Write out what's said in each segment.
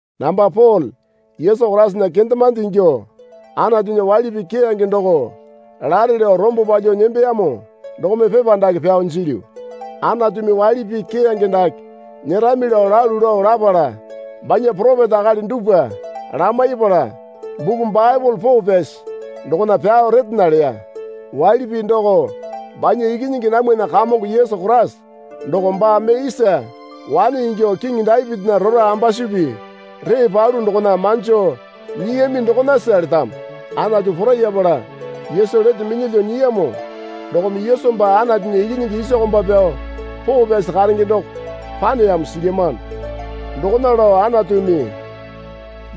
Namba Pole Yesu Koraisana kendemande ingyuo Anatunya waili pii keyange doko lare lao rombo palyuo nembeyamo dokome pepa dake pyao jilyu. Anatumi waili pii keyange dake nyerami lao lalu lao lapala banya poropeta akali dupwa lamaipala, buku Baepole poo pyasi dokona pyao retena leya. Waili pii doko banya Ikinyingi namwana Kamongo Yesu Koraisa doko baa mee isa wane ingyuo kiŋi Dapitinya rora ambasupi ree palu dokona manjo nyiyami dokonasa letamo. Anatu porayapala Yesu lete minyalyuo nyiyamo dokome Yesu baa Anatunya Ikinyingi isa komba pyao poo pyasi karenge doko paneyamo silyamano. Dokona lao Anatumi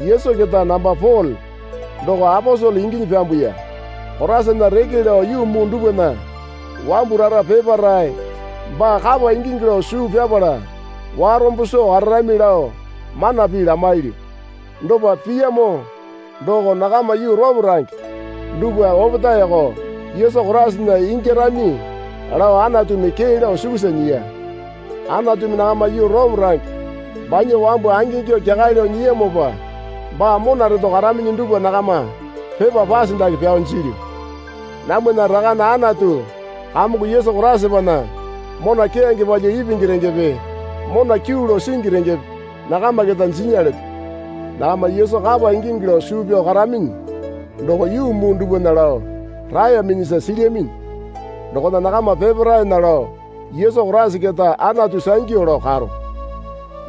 Yesu keta namba Pole doko aposele inginyi pyambuya. Koraisana reke lao yuu muu dupwana wambu rara peparae baa kapa ingingi lao suu pyapala warombo soo kararami lao mana pii lamailyu. Dopa piyamo doko nakama yuu Orome range dupwa opetaeko Yesu Koraisana ingyarami lao Anatumi kee lao sukusa nyiya. Anatumi nakama yuu Orome range banya wambu angingyuo kyakale lao nyiyamopa baa mona reto karaminyi dupwa nakama pepa pase dake pyao jilyu. Namwana Rakane Anatu Kamongo Yesu Koraisapana mona keyange palyuo ipingi rengepe mona kyuu lao singi rengepe nakama keta jinya leto. Nakama Yesu kapa ingingi lao suu pyao karaminyi doko yuu muu dupwana lao raeyaminyisa silyaminyi dokona nakama peparaena lao Yesu Koraisa keta Anatu sangyu lao karo.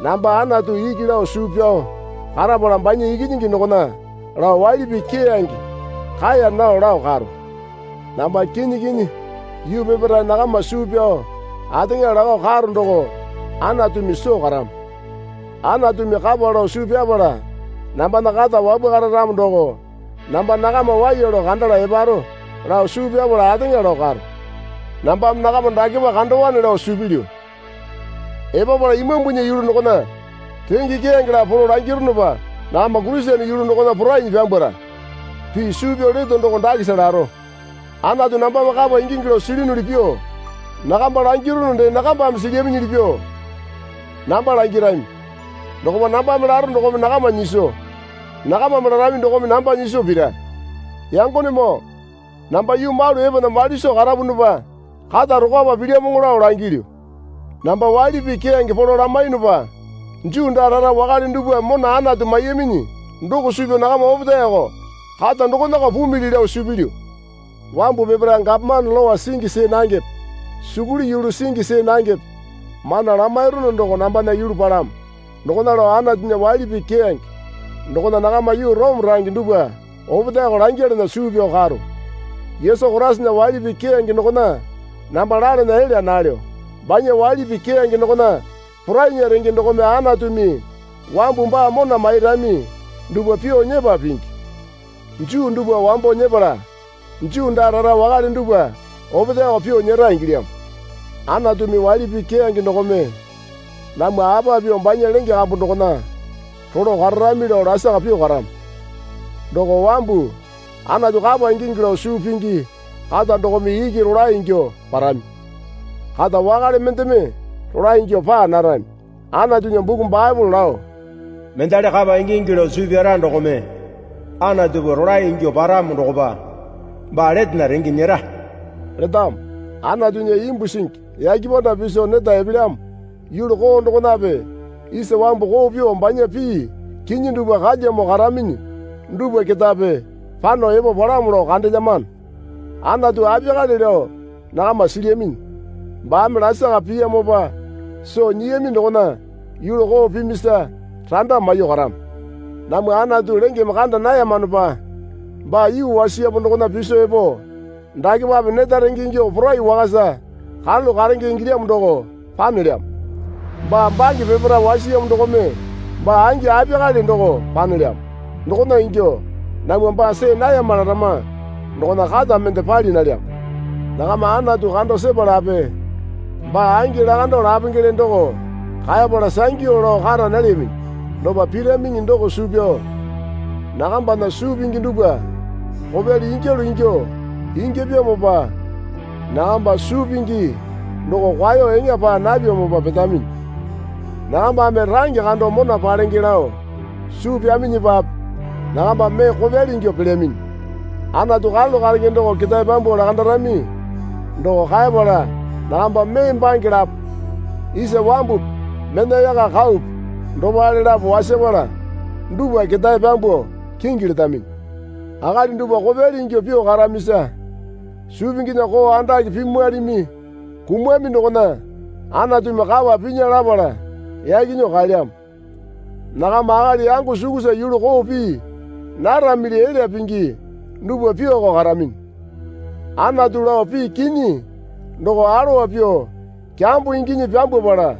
Namba Anatu iki lao suu pyao karapala banya Ikinyingi dokona lao waili pii keyange kaeya nao lao karo. Namba kinyi kinyi yuu peparae nakama suu pyao ateŋa lakao karo doko Anatumi soo karamo. Anatumi kapa lao suu pyapala nambana kata wapwakara ramo doko namba nakama waiya lao kandala eparo lao suu pyapala ateŋa lao karo. Nambame nakama dakepa kandowane lao suu pilyu. Epapala imambunya yulu dokona renge keyange lapo polo langirunupa nakama Kurisene yulu dokona porainyi pyambwara. Pii suu pyao leto doko dakesa laro. Anatu nambame kapa ingingi lao silyunuli pyuo nakamba langirunu dee nakambame silyaminyili pyuo namba langirami. Dokopa nambame laro dokome nakama nyiso, nakamame larami dokome namba nyiso pira. Yangonemoo namba yuu malu epana mali soo karapunupa kata rokwapa pilyamoŋo lao langilyu. Namba waili pii keyange polo lamaiyunupa Juu daa rara wakale dupwame mona Anatu maiyaminyi doko suu pyao nakama opetaeko kata dokonako pumili lao suu pilyu. Wambu peparae gapomane lowa singi see nangepe sukuli yulu singi see nangepe mana lamairunu doko nambana yulu palamo. Dokona lao Anatunya waili pii keyange dokona nakama yuu Orome range dupwa opetaeko langyalana suu pyao karo. Yesu Koraisana waili pii keyange dokona namba lalana elya nalyo. Banya waili pii keyange dokona porainya renge dokome Anatumi wambu baa mona mairami dupwa pyuo nyepa pingi. Juu dupwa wambo nyepala Juu daa rara wakale dupwa opetaeko pyuo nyera ingilyamo. Anatumi waili pii keyange dokome namwa apa pyuo banya lenge kambu dokona rolo kararami lao lasaka pyuo karamo. Doko wambu Anatu kapa ingingi lao suu pingi kata dokome iki rolae ingyuo parami. Kata wakale mendeme rolae ingyuo paa narami. Anatunya buku Baepole lao, Mendali kapa ingingi lao suu pyara dokome Anatupa rolae ingyuo paramo dokopa baa letena renge nyera letamo. Anatunya imbu singi yake panda piso neta epelyamo yulu koo dokonape isa wambu koo pyuo banya pii kinyi dupwa kalyamo karaminyi dupwa ketape pano epo palamo lao kandelyamano. Anatu apiyakale lao nakama silyaminyi. Baame lasaka piyamopa soo nyiyami dokona yulu koo pimisa randa maiyuo karamo. Namwa Anatu lengeme kanda nayamanopa baa yuu wasiyamo dokona piso epo dakepape neta renge ingyuo porai wakasa karalu karenge ingilyamo doko panelyamo. Baa bange peparae wasiyamo dokome baa angi apiyakale doko panelyamo. Dokona ingyuo namwa baa see nayama larama dokona kata mende pali nalyamo. Nakama Anatu kando sepalape baa angi lakando lapengele doko kaepala sangyu lao kara nalyaminyi. Dopa piraminyiŋi doko suu pyao nakambana suu pingi dupwa kopyali ingyalu ingyuo ingyapyamopa nakamba suu pingi doko kwaeyo eŋa paa napyamopa petaminyi. Nakambame range kando mona palenge lao suu pyaminyipape nakamba mee kopyali ingyuo pelyaminyi. Anatu karalu karenge doko ketae pyambuo lakandarami doko kaepala nakamba mee bange lapo isa wambupi mena yaka kaupi dopale lapo wasapala dupwa ketae pyambuo kingi letaminyi. Akali dupwa kopyali ingyuo pyuo karamisa suu pinginya koo andake pimwalimi kumami dokona Anatumi kapa pinya lapala yaki nyuo kaelyamo. Nakama akali yango sukusa yulu koo pii naramili elya pingi dupwa pyuoko karaminyi. Anatu lao pii kinyi doko alowa pyuo kyambo inginyi pyambwapala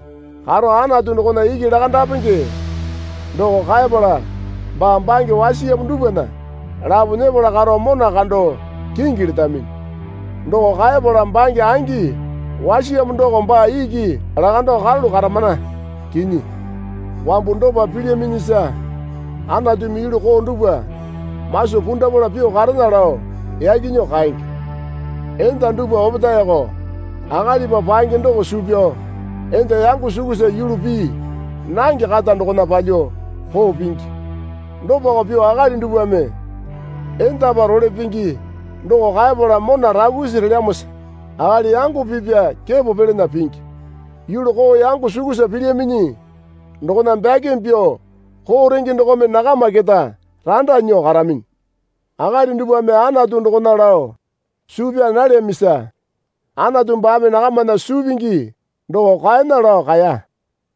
karo Anatu dokona iki lakandapenge doko kaeyapala baa bange wasiyamo dupwana lapo nyepala karo mona kando kingi letaminyi. Doko kaeyapala bange angi wasiyamo doko baa iki lakando karalu karamana kinyi. Wambu dopa pilyaminyisa Anatumi yulu koo dupwa maso pundapala pyuo karena lao yaki nyuo kaenge. Enda dupwa opetaeko akalipa paenge doko suu pyao enda yango sukusa yulu pii nange kata dokona palyuo koo pingi. Dopako pyuo akali dupwame endapa role pingi doko kaepala mona rakusi relyamosa akali yango pipya kepo pyalana pingi. Yulu koo yango sukusa pilyaminyi dokona bakimi pyuo koo renge dokome nakama keta randa nyuo karaminyi. Akali dupwame Anatu dokona lao suu pyaa nalyamisa Anatu baame nakamana suu pingi doko kwaena lao kaeya.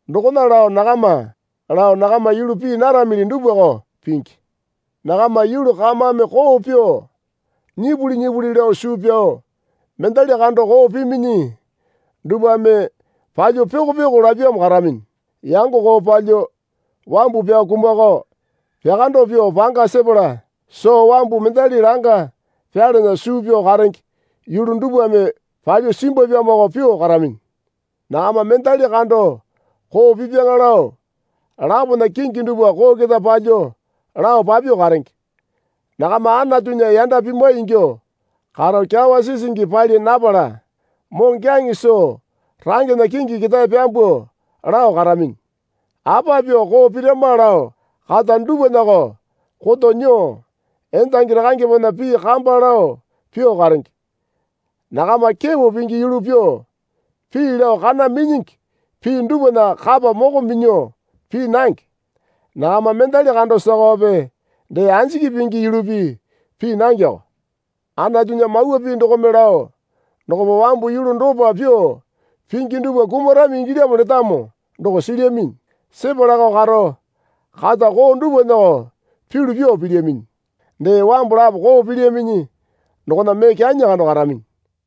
Dokona lao nakama lao nakama yulu pii naramili dupwako pingi. Nakama yulu kamame koo pyuo nyipuli nyipuli lao suu pyao mendali kando koo piminyi dupwame palyuo pyoko pyoko lapyamo karaminyi. Yango koo palyuo wambu pyao kumakao pyakando pyuo panga sepala soo wambu mendali langa pyalana suu pyao karenge yulu dupwame palyuo simbwapyamoko pyuo karaminyi. Nakama mendali kando koo pipya lao lapona kingi dupwa koo keta palyuo lao papyuo karenge. Nakama Anatunya yanda pimwai ingyuo karo kyawa sisingi pali napala moŋokyaŋe soo rangena kingi ketae pyambuo lao karaminyi. Apa pyuo koo pirama lao kata dupwanako koto nyuo endangi rakangepena pii kamba lao pyuo karenge. Nakama kepo pingi yulu pyuo, pii lao kana minyingi pii dupwana kapa moko minyuo pii nange. Nakama mendali kando sakawape dee anjiki pingi yulupi pii nangeko. Anatunya mawa pii dokome lao dokopa wambu yulu dopa pyuo pingi dupwa kumarami ingilyamo letamo doko silyaminyi. Sepalako karo kata koo dupwanako pyulu pyuo pilyaminyi. Dee wambu lapo koo pilyaminyi dokona mee kyanyi kando karaminyi.